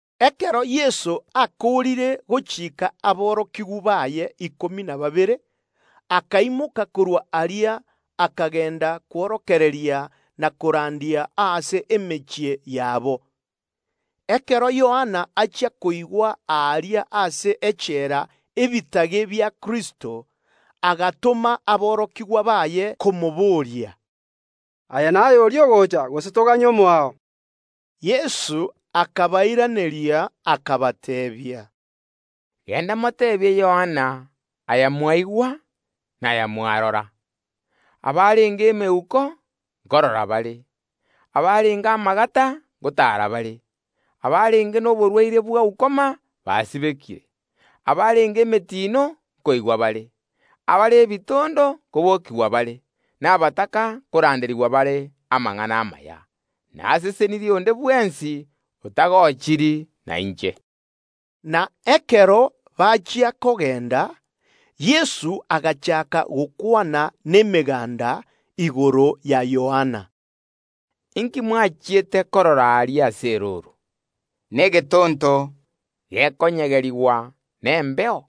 Ekero Yeso akoorire gochiika aborokigwa baye ikomi na babere, akaimoka korwa aria, akagenda kworokereria na korandia ase emechie yabo. Ekero Yohana achia koigwa aaria ase echela ebitage bia Kristo, agatoma aborokigwa baye komoboria, “Aye naye oria ogocha, gose toganye omoao?” Yeso akabairaneria, akabateebia, “Genda moteebie Yohana aya mwaigwa na korora: Abarenge emeuko nkorora bare, abarenge amagata ngotaara bare, abarenge noborwaire bwa ukoma basibekire, abarenge emetino nkoigwa bare, abare ebitondo nkobokigwa bare, na abataka nkoranderigwa bare amang’ana amaya. Nasesenirie onde bwensi otagochiri nainche.” Na ekero bachia kogenda, Yeso agachaaka gokwana nemeganda igoro ya Yohana, Inki mwachiete korora aria ase erooro? Negetonto gekonyegerigwa nomwaga?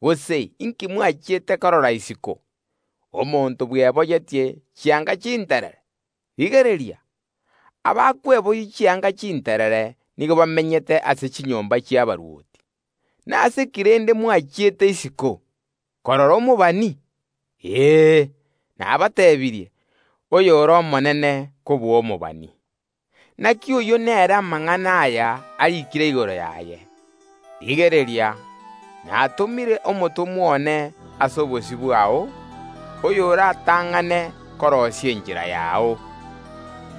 Gose inki mwachiete korora isiko? Omonto bweboyetie chianga chinterere? Rigereria, abakweboyia chianga chinterere nigo bamenyete ase chinyomba chi’abarwoti. Nase ki rende mwasogete isiko? Korora omobani? Ee, nabateebirie, oyore omonene kobua omobani. Inaki oyio nere amang’ana aya ariikire igoro yaye: Rigereria, natomire omotomwa one ase obosio bwao, oyo oratang’ane koroisia enchera yao!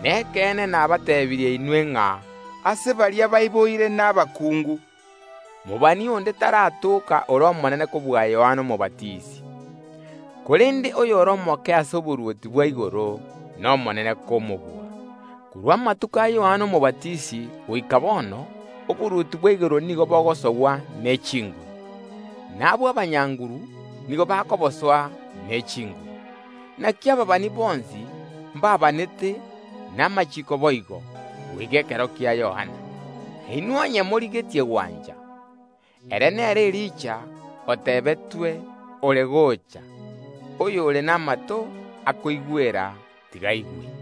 Nekeene nabateebirie inwe ng’a ase baria baiboire nomokuungu, mobani onde taratoka ore omonene kobua Yohana Omobatisi; korende oyore omoke ase oborwoti bwa igoro nomonene komobua. Korwa amatuko a Yohana Omobatisi goika bono oborwoti bwa igoro nigo bogosogwa neburuburu, na abwo abanyaburuburu nigo bakobosoa ne chinguru. Inaki ababani bonsi mbaabanete, na amachiiko boigo, goika ekero kia Yohana. Na inwe onye morigetie gwancha, ere nere Elija otebetwe ore gocha. Oyore namato akoigwera, tiga aigwe.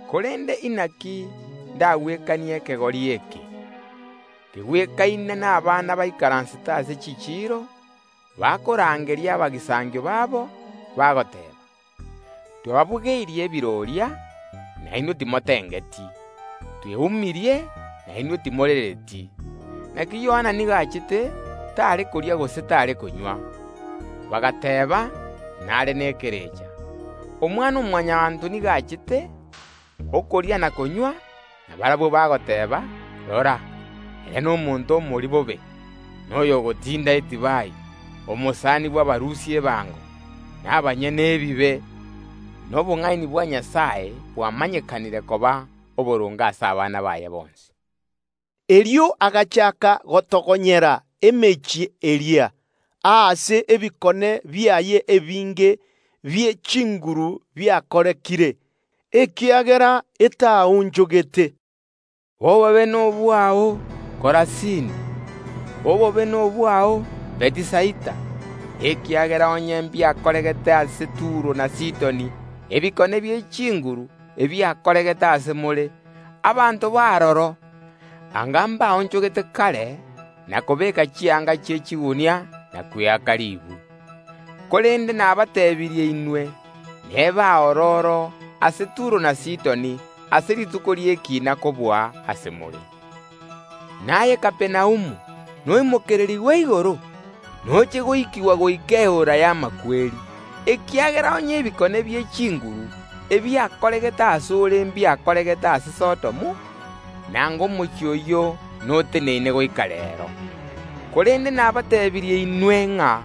Korende inaki ndakegwekanie ekegori eke? Nigo kegwekaine abana baikaransete ase chichiiro, bakorangeria abagisangio babo, bagoteeba; “Twababugeirie ebiroria, na inwe timotengeti; tweumirie, na inwe timorereti”. Inaki Yohana nigo achete, tare koria gose tare konywa: bagateeba; Nare nekerecha. Omwana-o-Mwanyabaanto nigo achete okoria na konywa, na barabwo bateebire: Rora, rinyandambe na omotindu bw’edivai, omosani bw’abarusia ebango na abanyene ebibe! Na obong’aini bwa Nyasae bwamanyekanire koba oboronge ase abana baye bonsi. Erio Yeso agachaaka gotogonyera emechie eria, aase ebikone biaye ebinge bie chinguru biakorekire, ekiagera etaonchogete: “Obobe nobwao, Korasini! Obobe nobwao, Bethisaida! Ekiagera onye ebikone bie chinguru biakoregete ase more mbiakorekanete ase Turo na Sidoni, anga abanto b’aroro mbaonchogete kare, ase okobeeka chianga chi’echigunia, na kweaka riibu. Korende nabateebirie inwe, n’ebe aororo ase Turo na Sidoni ase rituko ri’ekiina kobua ase more. N’aye Kapernaumu, noimokererigwe igoro? Noche goikigwa goika Eora y’Amakweri, ekiagera onye ebikone bie chinguru ebiakoregete ase ore mbiakoregete ase Sodomu, anga omochie oyio noteneine goika reero. Korende nabateebirie inwe ng’a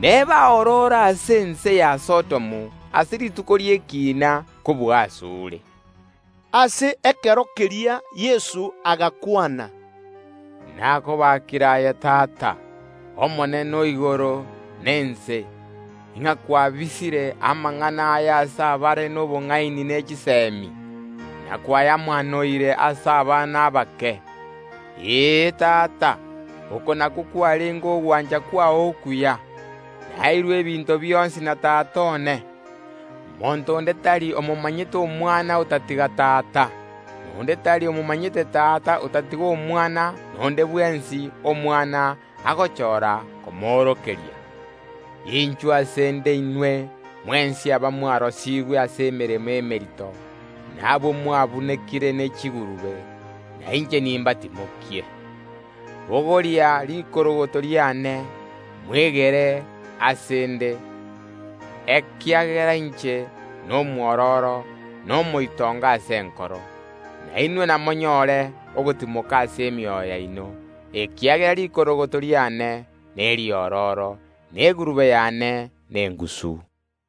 n’ebe aororo ase ense ya Sodomu ase rituko ri’ekiina kobua ase ore.” Ase ekero keria Yeso agakwana, “Nakobaakire aye Tata, Omonene o igoro na ense, ng’a kwababisire abare nobong’aini ne chisemi amang’ana aya, na kwayamaanoire ase abana abake. Ee, Tata, oko nakwo kwarenge ogwancha kwao okuya. “Naeirwe ebinto bionsi na Tata one; monto onde tari omomanyete Omwana otatiga Tata; na onde tari omomanyete Tata otatiga Omwana, na ere oria Omwana agochora komomaanorera. Inchuo ase ’nde inwe mwensi aba mwarosigwe ase emeremo emerito, na abwo mwabunekire ne chigurube, na inche nimbatimokie. Bogoria rikorogoto riane, mwegere ase ’nde, ekiagera inche nomokanyeku na omoitongo ase enkoro, na inwe namonyore ogotimoka ase emioyo yaino, ekiagera rikorogoto riane neriororo, na egurube y’ane nengusu.”